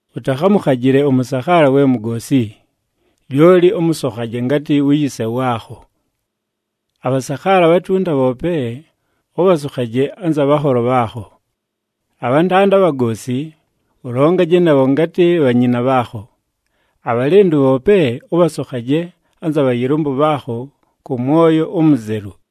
Ʉtakhamʉkhajɨle ʉmʉsakhaala we mugoosi, lyoli ʉmʉsokhaje ngatɨ wu yise waakho. Abhasakhaala abhatunta bhoope, ʉbhasokhaje anza bhanholo bhaakho. Abhantanda abhagoosi, ʉlongaje nabho ngatɨ bhanyina bhaakho. Abhalɨndʉ bhoope ʉbhasokhaje anza bhayɨlʉmbʉ bhaakho kʉ mwoyo umuzelu.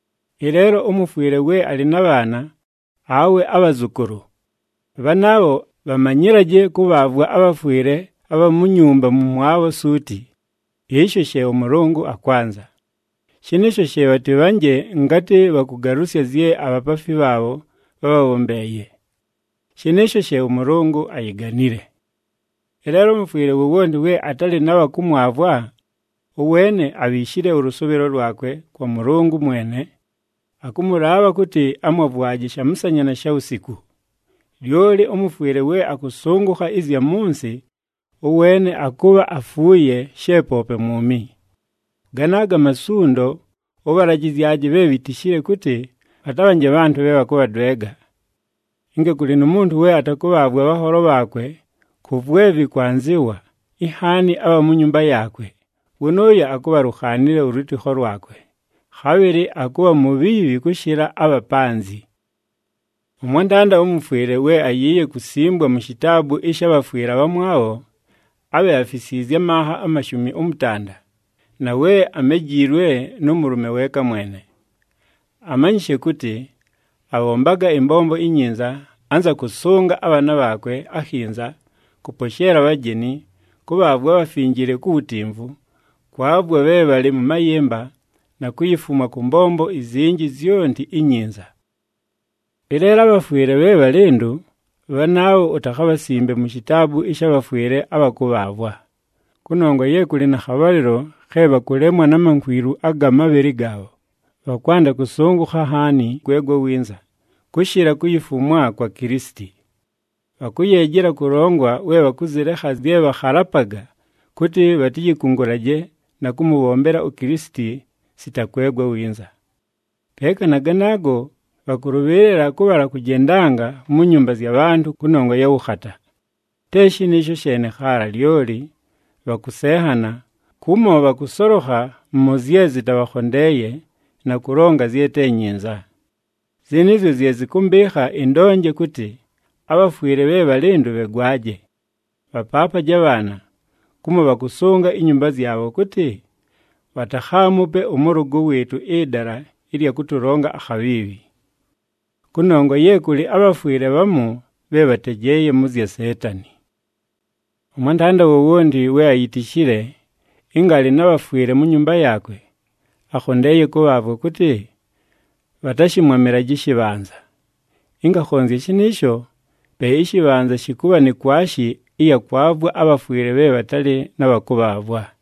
Ɨleelo ʉmʉfwɨle we alɨ na bhaana, awe abhazʉkʉlʉ, bhanaabho bhamanyɨlaje kʉbhaavwa abhafwɨle abha mu nyumba mʉmwabho suuti, ɨsho she ʉMʉlʉngʉ akwanza. Shɨnɨɨsho she bhatɨbhanje ngatɨ bhakʉgalʉsya zye abhapaafi bhaabho bhábhabhombeeye, shɨnɨɨsho she ʉMʉlʉngʉ ayiganile. Ɨleelo ʉmʉfwɨle wowonti we atalɨ na bha kʉmwavwa, ʉweene abhiishile ʉlʉsʉʉbhɨlo lwakwe kwa Mʉlʉngʉ mwene, akʉmʉlaabha kʉtɨ amwavwaje shamʉsanya na shawusiku. Lyoli ʉmʉfwɨle we akʉsʉngʉkha ɨzya mʉ nsɨ, ʉweene akʉbha afuuye, she poope mwumi. Ganaago amasundo, ʉbhalajɨzyaje bhe bhitishile kʉtɨ, bhatabhanje bhantʉ bhe bhakʉbhadwega. Ɨnga kʉlɨ nu muntu we atakʉbhaavwa abhanholo bhaakwe kʉ vwe vɨkwanzɨwa, inhaani abha mu nyumba yaakwe, wʉnʉʉyo akʉbha alukhaanile ʉlwɨtɨkho lwakwe, khabhɨlɨ akʉbha mubhiibhi kʉshɨla abha panzɨ. Ʉmwantanda ʉmʉfwɨle we ayiiye kusimbwa mu shitaabu ɨsha bhafwɨle abhamwabho, abhe afisiizye amanha amashumi ʉmʉtanda, na we amejiilwe nʉ mʉlʉme weeka mwene. Amanyishe kʉtɨ, abhombaga ɨmbombo inyinza, anza kʉsʉnga abhaana bhaakwe akhinza, kʉposheela abhajeni, kʉbhaavwa abhafinjile ku wutimvu, kwavwa bhe bhalɨ mʉ mayɨmba, na kuyifumwa kʉ mbombo izinji zyonti inyinza. Ɨleelo abhafwɨle bhe bhalɨndʉ, bhanaabho utakhabhasimbe mu shitaabu ɨsha bhafwɨle abha kʉbhaavwa. Kʉnongwa ye kʉlɨ na khabhalɨlo khe bhakʉlemwa na mankwilu aga mabhɨlɨ gaabho, bhakwanda kʉsʉngʉkha nhaani kwegwa winza, kʉshɨla kuyifumwa kwa Kilisiti. Bhakʉyeejela kʉlongwa we bhakʉzɨlekha zye bhakhalapaga kʉtɨ, bhatɨyɨkʉngʉlaje na kʉmʉbhombela uKilisiti sita kwegwa winza. Peeka na ganaago, bhakʉlʉbhɨɨlɨla kʉbhala kʉjendanga mu nyumba zya bhantʉ kʉnongwa ya wʉkhata. Te shɨnɨɨsho sheene khaala, lyoli bhakʉsenhana, kumo bhakʉsolokha mʉ zye zɨtabhakhondeeye, na kʉlonga zye te nyinza. Zɨnɨɨzyo zye zɨkʉmbɨɨkha ɨndonje kʉtɨ, abhafwɨle bhe bhalɨndʉ bhegwaje. Bhapaapaje abhaana, kumo bhakʉsʉnga inyumba zyabho kʉtɨ, bhatakhaamupe ʉmʉlʉgʉ wɨɨtʉ ɨdala ɨlya kʉtʉlonga akhabhiibhi. Kʉnongwa ye kʉlɨ abhafwɨle bhamu bhe bhatejeeye mʉ zya Seetani. Ʉmwantanda wowonti we ayitishile ɨnga alɨ na bhafwɨle mu nyumba yaakwe, akhondeeye kʉbhaavwa kʉtɨ, bhatashɨmwamɨlaje ɨshɨbhanza. Ɨnga akhonzya shɨnɨɨsho, pe ɨshɨbhanza shɨkʉbha ni kwashi ɨya kwavwa abhafwɨle bhe bhatalɨ na bha kʉbhaavwa.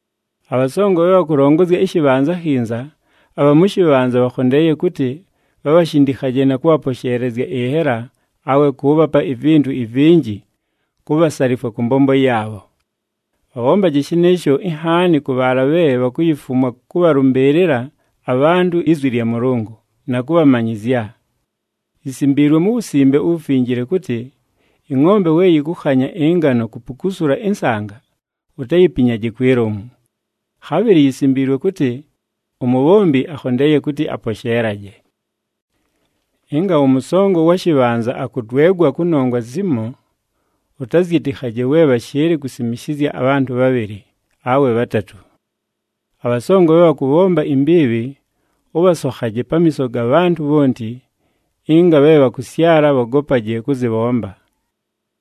Abhasongo bhe bhakʉlongozya ɨshɨbhanza akhinza, abha mʉ shɨbhanza bhakhondeeye kʉtɨ, bhabhashindikhaje na kʉbhaposheelezya ɨnhela awe kʉʉbhapa ivintu ivinji kubhasalifwa kʉ mbombo yaabho. Bhabhombaje shɨnɨɨsho, inhaani kʉ bhaala bhe bhakuyifumwa kʉbhalʉmbɨɨlɨla abhantʉ izwi lya Mʉlʉngʉ, na kʉbhamanyɨzya. Yisimbiilwe mu Wusimbe uWufinjile kʉtɨ, “Ɨngʼombe we yɨkʉkhanya ɨngano kupukusula ɨnsanga, utayipinyaje kwi lomu.” Khabhɨlɨ yisimbiilwe kʉtɨ, “Umubhombi akhondeeye kʉtɨ aposheelaje.” Ɨnga ʉmʉsongo ʉwa shɨbhanza akʉdwegwa kʉnongwa zimo, ʉtazyɨtɨkhaje we bhashɨɨlɨ kusimishizya abhantʉ bhabhɨlɨ, awe bhatatʉ. Abhasongo bhe bhakʉbhomba imbiibhi, ʉbhasokhaje pamiiso ga bhantʉ bhonti, ɨnga bhe bhakʉsyala bhogopaje kʉzɨbhomba.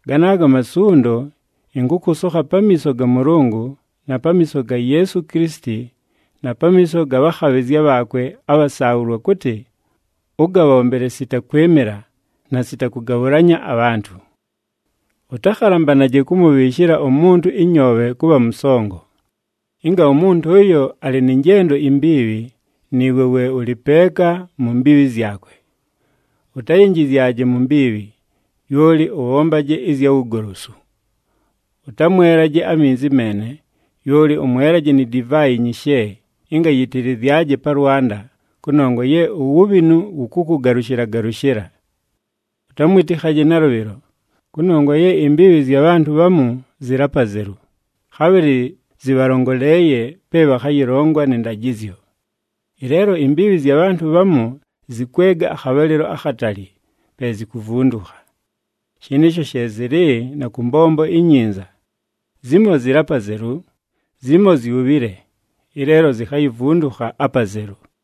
Ganaago amasundo, ɨnkʉkʉsokha pamiiso ga Mʉlʉngʉ, na pamiiso ga Yeesu Kilisiti, na pamiiso ga bhakhabhɨzya bhaakwe abhasaabhʉlwa kʉtɨ, ʉgabhombele sita kwɨmɨla, na sita kʉgabhʉlanya abhantʉ. Ʉtakhalambanaje kʉmʉbhɨɨshɨla umuntu ɨnyoobhe kʉbha mʉsongo. Ɨnga umuntu ʉyo alɨ nɨ njendo imbiibhi, nɨɨwe we ʉlɨ peeka mu mbiibhi zyakwe. Utayinjizyaje mu mbiibhi, lyoli ʉbhombaje ɨzya wugolosu. Ʉtamwelaje aminzi meene, lyoli ʉmwelaje ni divaayi nyishe, ɨnga yɨtɨlɨzyaje pa lwanda, kʉnongwa ye uwubhinu wʉkʉkʉgalʉshɨla-galʉshɨla. Ʉtamwɨtɨkhaje nalʉbhɨlo, kʉnongwa ye imbiibhi zya bhantʉ bhamu zɨlɨ apazelu, khabhɨlɨ zɨbhalongoleeye pe bhakhayɨlongwa nɨ ndajɨzyo. Ɨleelo imbiibhi zya bhantʉ bhamu zɨkwega akhabhalɨlo akhatali, pe zikuvundukha. Shɨnɨɨsho she zɨlɨ na kʉ mbombo inyinza. Zimo zɨlɨ apazelu, zimo zyubhile, ɨleelo zikhayivundukha apazelu.